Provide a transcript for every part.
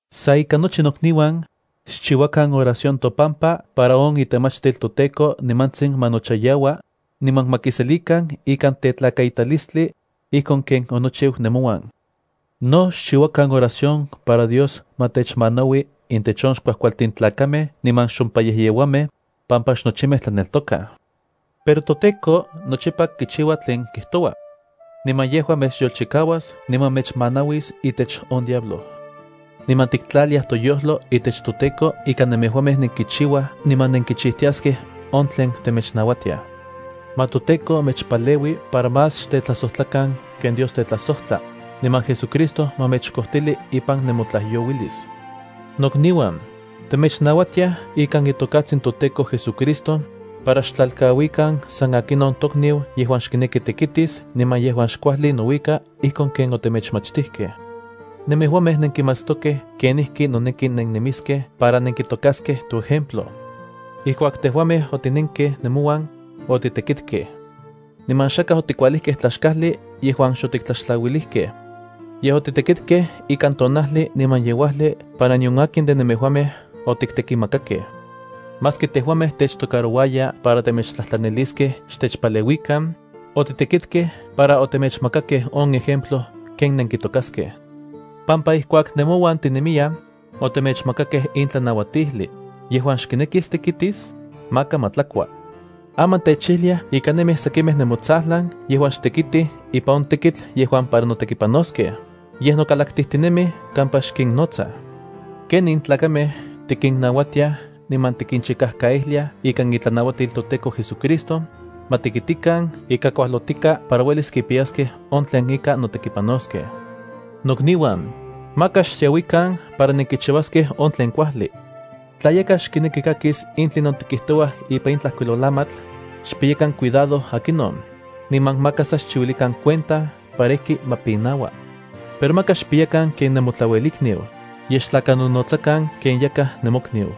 Sa ika nochi nokniuan, xchiuakan oración topampa para on itemachtil toTEKO nimantsin ma nochayaua, niman ma kiselikan ikan tetlakaitalistli, ijkon ken onochiu nemouan. No xchiuakan oración para Dios ma techmanaui intech on xkuajkualtin tlakamej niman xompayejyeuamej, pampa xnochimej tlaneltokaj. Pero toTEKO nochipa kichiua tlen kijtoua. Niman yejua mechyolchikauas niman mechmanauis itech on diablo. Niman tiktlaliaj toyojlo itech toTEKO ika nemejuamej nenkichiuaj niman nenkichijtiaskej on tlen temechnauatiaj. Ma toTEKO mechpaleui para más xtetlajsojtlakan ken Dios tetlajsojtla, niman JesuCristo ma mechkojtili ipan nemotlajyouilis. Nokniuan, temechnauatiaj ikan itokatsin toTEKO JesuCristo, para xtlalkauikan san akinon tokniu yejuan xkineki tekitis niman yejuan xkuajli nouika ijkon ken otemechmachtijkej. Nemejuamej nenkimatstokej kenijki noneki nennemiskej para nenkitokaskej toejemplo. Ijkuak tejuamej otinenkej nemouan, otitekitkej. Niman xakaj otikualijkej tlaxkajli yejuan xotiktlaxtlauilijkej. Yej otitekitkej ikan tonajli niman yeuajli para nion akin de nemejuamej otiktekimakakej. Maski tejuamej techtocarouaya para temechtlajtlaniliskej xtechpaleuikan, otitekitkej para otemechmakakej on ejemplo ken nenkitokaskej. Pampa ijkuak nemouan tinemiyaj, otemechmakakej in tlanauatijli: “Yejuan xkinekis tekitis, maka ma tlakua.” Aman techijliaj ika nemij sekimej nemotsajlan yejuan xtekitij ipan on tekitl yejuan para notekipanoskej, yej nokalaktijtinemij kampa xkinnotsaj. Kenin tlakamej tikinnauatiaj niman tikinchikajkaijliaj ikan itlanauatil toTEKO JesuCristo, ma tekitikan ika kuajlotika para uelis kipiyaskej on tlen ika notekipanoskej. Nokniuan, maka xsiauikan para nenkichiuaskej on tlen kuajli. Tla yakaj xkineki kakis in tlinon tikijtouaj ipan in tlajkuilolamatl, xpiyakan cuidado akinon, niman maka sa xchiuilikan cuenta para ijki ma pinaua. Pero maka xpiyakan ken nemotlauelikniu, yej xtlakanonotsakan ken yakaj nemokniu.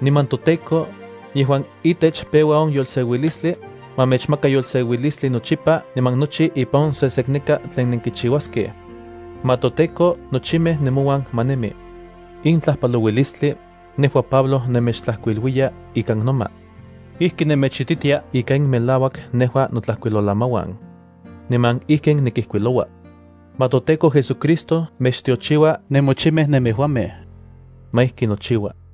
Niman toTEKO, yejuan itech peua on yolseuilistli, ma mechmaka yolseuilistli nochipa niman nochi ipan on sesekneka tlen nenkichiuaskej. Ma toTEKO nochimej nemouan ma nemi. In tlajpalouilistli, nejua Pablo nemechtlajkuiluiya ikan noma. Ijkin nemechititia ika in melauak nejua notlajkuilolamauan. Niman ijkin nikijkuiloua. Ma toTEKO JesuCristo mechtiochiua nemochimej nemejuamej. Ma ijki nochiua.